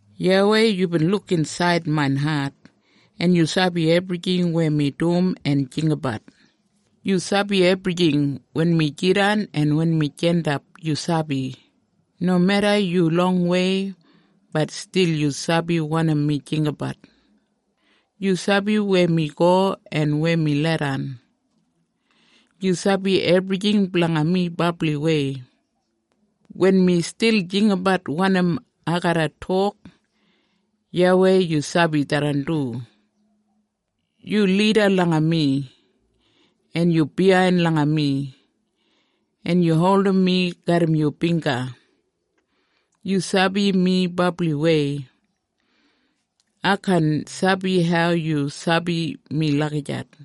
YAWEI, yubin luk insaid main hat, en yu sabi ebrijing weya mi dum en jinggabat. Yu sabi ebrijing. Wen mi jidan en wen mi jandap, yu sabi. Nomeda yu longwei, bat stil yu sabi wanim mi jinggabat. Yu sabi weya mi go en weya mi leidan. Yu sabi ebrijing blanga mi brabliwei. Wen mi stil jinggabat wanim ai garra tok, YAWEI, yu sabi tharran du. Yu lida langa mi, en yu biyain langa mi, en yu holdim mi garram yu bingga. Yu sabi mi brabliwei! Ai kaan sabi hau yu sabi mi lagijat.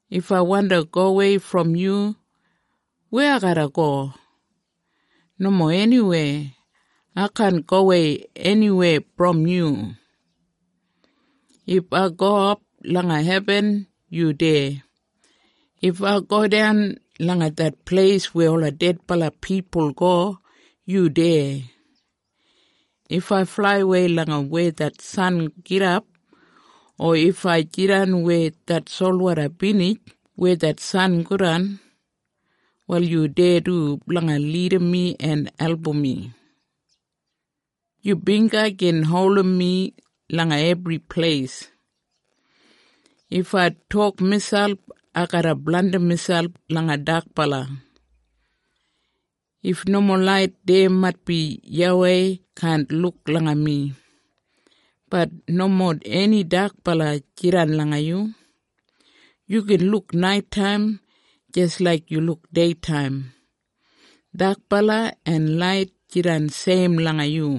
If ai wandi gowei brom yu, weya ai garra go? Nomo eniweya! Ai kaan gowei eniweya brom yu. If ai gowap langa hebin, yu deya. If ai godan langa det pleis weya ola dedbala pipul go, yu deya. If ai flaiwei langa weya det san gidap, o if ai jidan weya det solwoda binij weya det san godan, wal yu deya du blanga lidim mi en album mi. Yu bingga gin holdim mi langa ebri pleis. If ai tok miselp, “Ai garra blandim miselp langa dakbala. If nomo lait deya maitbi YAWEI kaan luk langa mi.” Bat nomo eni dakbala jidan langa yu. Yu gin luk naitaim jis laik yu luk deitaim. Dakbala en lait jidan seim langa yu.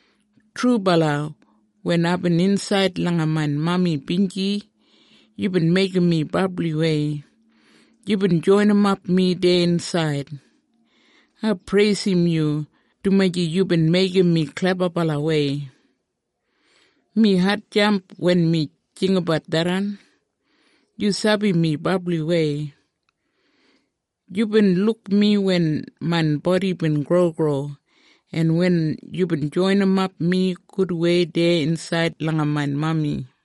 Trubala, wen aibin insaid langa main mami binji, yubin meigim mi brabliwei. Yubin joinimap mi deya insaid. Ai preisim yu dumaji yubin meigim mi klebabalawei. Mi hatjamp wen mi jinggabat tharran. Yu sabi mi brabliwei. Yubin luk mi wen main bodi bin grogro, en wen yubin joinimap mi gudwei deya insaid langa main mami.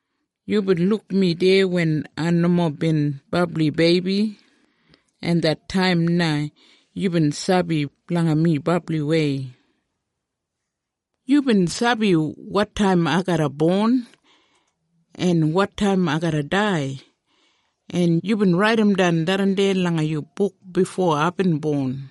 Yubin luk mi deya wen ai nomo bin brabli beibi, en det taim na yubin sabi blanga mi brabliwei. Yubin sabi wotaim ai garra bon, en wotaim ai garra dai, en yubin raidimdan tharran langa yu buk bifo aibin bon.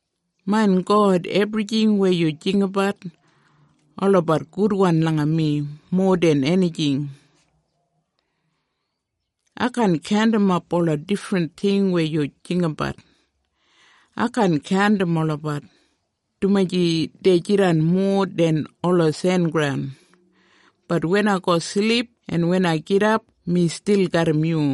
Main God, ebrijing weya yu jinggabat, olabat gudwan langa mi, mowa den enijing. Ai kaan kaundimap ola difrin ting weya yu jinggabat. Ai kaan kaundim olabat, dumaji dei jidan mowa den ola sengraun. Bat wen ai go silip en wen ai gidap mi stil garram yu.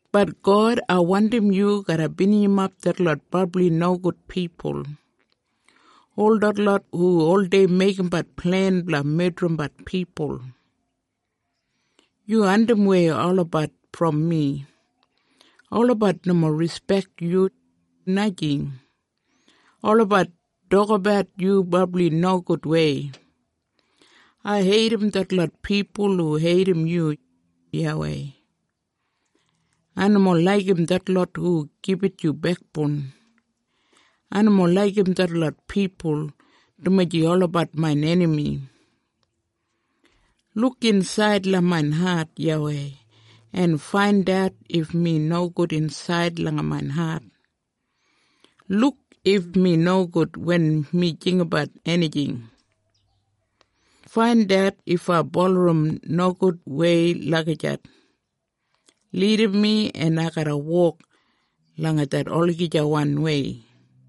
Bat God, ai wandim yu garra binijimap detlot brabli nogud pipul, ol detlot hu oldei meigimbat plen blanga medrimbat pipul. Yu andimwei olabat brom mi! Olabat nomo rispek yu, najing! Olabat tokabat yu brabli nogudwei. Ai heidim detlot pipul hu heidim yu, YAWEI. Ai nomo laigim detlot hu gibit yu bekboun. Ai nomo laigim detlot pipul, Dumaji olabat main enami. Luk insaid langa main hat, YAWEI, en faindat if mi nogud insaid langa main hat. Luk if mi nogud wen mi jinggabat enijing. Faindat if ai bulurrum nogudwei lagijat. Lidim mi en ai garra wok langa det olagijawanwei.